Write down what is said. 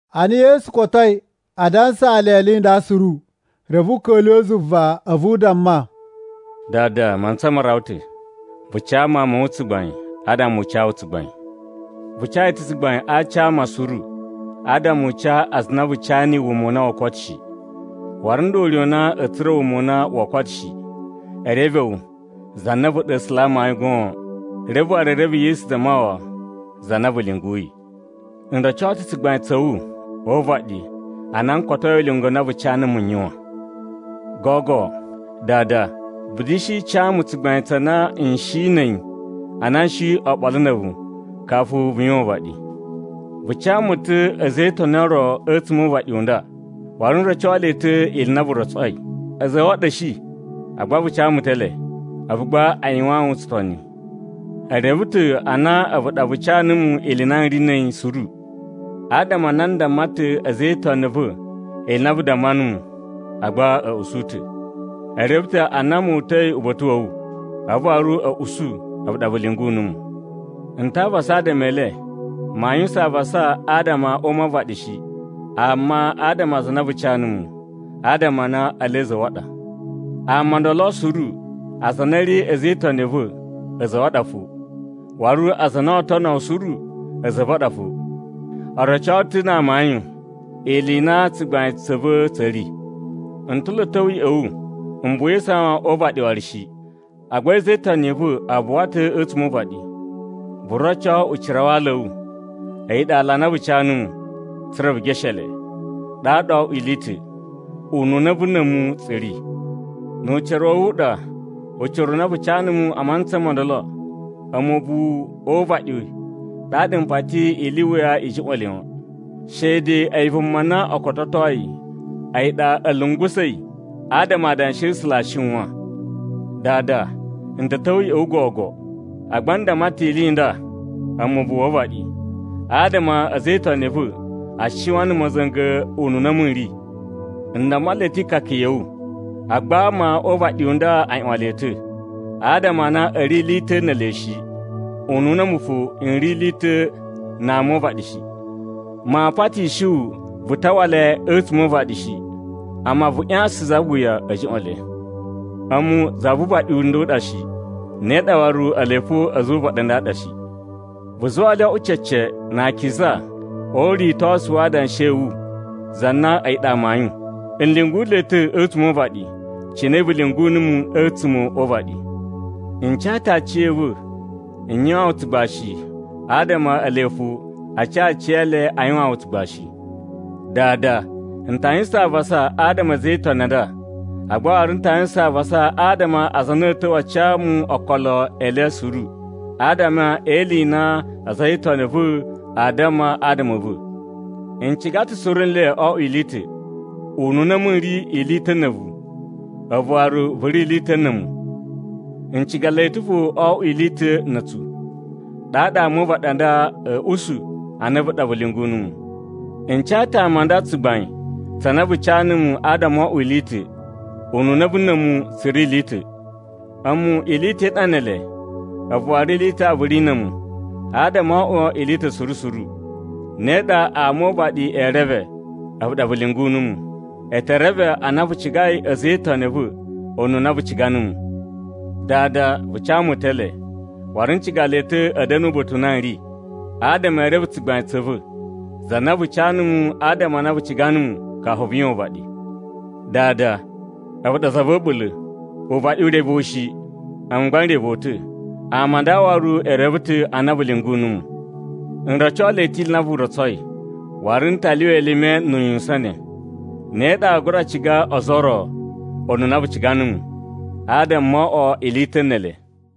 Ana Yesu kotoi a dansaa le ili i nda suru, reve u ka̱lyuwa̱ zuva a̱vu u damma, “Dada, mantsa ma rawa ta̱. Vu ca Mawun ma̱ wu tsugbain adama u ca wu tsugbain. Vu ca yi ta̱ tsugbain a aci a ama suru adama u ca aza a na vu ca niyi wuma u na woo koto shi. Waru nda ure u na a̱a̱ tsura̱ wuma u na woo koto shi: e reve wu, za na a̱vu ɗa A̱sula̱ a amayun goon, reve waru e reve Yesu Zamawawa, za na vu lyunguyi. N roco ta̱ tsugbain tsa̱ wu o uvaɗi ana n kotoi ulinga u na vu ca numu n yuwan. Gogo, Dada, vu da̱shi ca mu tsugbain tsa na n shi na̱ a̱yi ana n shi oɓolo na̱ a̱vu kafu vu yuwan uvaɗi. “Vu ca mu ta̱ a̱za̱ e itoni o ro a̱tsuma̱ o uvaɗi u nda, waru n roco le ta̱ ili i na vu rotsoi. A̱za̱ a̱ wu a ɗa a̱ shi, agba vu ca mu ta̱ ele, a̱vu gba a yuwaan wu tsutoni. E reve ta̱ a na a̱vu ɗa vu ca numu ili i na n ri na̱ a̱yi suru. Adama a na n damma ta̱ a̱za̱ e itoni a̱ va̱ ili i na vu damma numu, agba a̱ usu ta̱. E reve ta̱ a na mu uta̱i uba̱ta̱ wa̱ wu, a̱vu waru a̱ usu a̱vu ɗa vu lyungu numu. N ta avasa adama e le. Maa yuwusan avasa adama a ama o uvaɗi shi, amma adama a aza a na vu ca numu, adama a na ele a̱za̱ a̱ wu a ɗa. Ama o ndolo suru aza a na a̱ ri a̱za̱ e itoni a̱ va̱ a̱za̱ a̱ wu a ɗa fo, waru aza a na oo tono wu suru a̱za̱ a̱ va̱ a ɗa fo. O roco ta̱ na amayun ili i na tsugbain tsa̱ va̱ tsa̱ ri. N ta̱ lo a̱ ta̱wa̱ ya̱ꞌa̱ wu. M buwa e isawan o uvaɗi waru shi. Agba a̱za̱ e itoni i va̱ a buwa ta̱ a̱tsuma̱ o uvaɗi. Vu roco ucira wa ala a̱ wu, a̱yi ɗa ala a na vu ca numu, tsa̱ra̱ vu geshe le. Ɗaɗa oo oꞌwo ili i ta̱, ununa a̱vu na̱ a̱mu tsu ri. Nu ucira wa̱ wu u ɗa, ucira u na vu ca numu a mantsa mo ndolo a̱mu ubuwu o uvaɗi ɗaɗa m putsayi ili i wuya a̱ juꞌwa̱n le. Shede a̱yi vuma na o kototoi a̱yi ɗa a̱ lungusa̱i adama Adanshi a̱ A̱sula̱ a shiwan. “Dada, n ta̱ ta̱wa̱ ya̱ꞌa̱ wu gogo. Agba n damma ta̱ ili i nda a̱mu ubuwu o uvaɗi, adama a̱za̱ e itoni a̱ va̱ a shiwan na̱ ma̱za̱nga̱ ununa a̱mu n ri. N damma le ta̱ ikaka ya̱ wu. Agba ama o uvaɗi u nda a ꞌyuwan le ta̱, adama a na a̱ ri ili i ta̱ ne ele shi, ununa a̱mu fo n ri ili i ta̱ na ama o uvaɗi shi. Maa patishi wu vu tawa le a̱tsuma̱ o uvaɗi shi, amma vu ꞌyasan za wuya a̱ juꞌwa̱n le. A̱mu za vu uvaɗi u nda u ɗa shi. Ne ɗa waru ele fo a̱za̱ o uvaɗi a nda a ɗa shi. Vu zuwa le o oꞌwo cece na akiza o uritosu wa adanshi a̱ wu za na a̱yi ɗa amayun. N lyungu le ta̱ a̱tsuma̱ o uvaɗi, cine vu lyungu numu a̱tsuma̱ o uvaɗi. N ca ta̱ aciya̱va̱ n yuwaan wu tsugbashi adama ele fo a ca aciyele a yuwaan wu tsugbashi. “Dada, n ta yuwusan avasa adama a̱ a̱za̱ e itoni a nda, agba waru n ta yuwusan avasa adama a aza a na a̱a̱ ta̱wa̱ a ca mu okolo e le suru, adama e ili i na a̱za̱ e itoni a̱ va̱ aa damma adama a̱ va̱. N ciga ta̱ suru nle o oꞌwo ili i ta̱, ununa a̱mu n ri ili i ta̱ na̱ a̱vu, a̱vu waru vu ri ili i ta̱ na̱ a̱mu. N ciga le ta̱ fo o oꞌwo ili i ta̱ na̱ a̱tsu. Ɗaɗa ama o uvaɗi a nda a̱a̱ usu a na a̱vu ɗa vu lyungu numu. N ca ta̱ ama a nda tsugbain tsa na vu ca numu adama o oꞌwo ili i ta̱, ununa a̱vu na̱ a̱mu tsu ri ili i ta̱. A̱mu ili i ta̱ i ɗa ne ele, a̱vu waru ili i ta̱ vu ri na̱ a̱mu, adama o oꞌwo ili i ta̱ suru suru. Ne ɗa ama o uvaɗi ee reve a̱vu ɗa vu lyungu numu. E te reve a na vu cigai a̱za̱ e itoni a̱ va̱ ununa vu ciga numu. “Dada, vu ca mu ta̱ ele, waru n ciga le ta̱ a̱ da̱na̱ uba̱ta̱ u na n ri, adama ee ene tsugbain tsa̱ va̱, za na vu ca numu adama a na vu ciga numu kafu vu yuwan uvaɗi. “Dada, a̱vu ɗa za va̱ a̱ɓula̱. Uvaɗi u reve wu shi, a̱mu gba n reve wu ta̱, ama a nda waru e reve ta̱ a na vu lyungu numu. N roco le ta̱ ili i na vu rotsoi, waru n ta lyuwa elime nu uyuwusan ne. Ne ɗa aa gura ciga ozo o ro ununa vu ciga numu, adama moo oꞌwo ili i ta̱ ne ele.”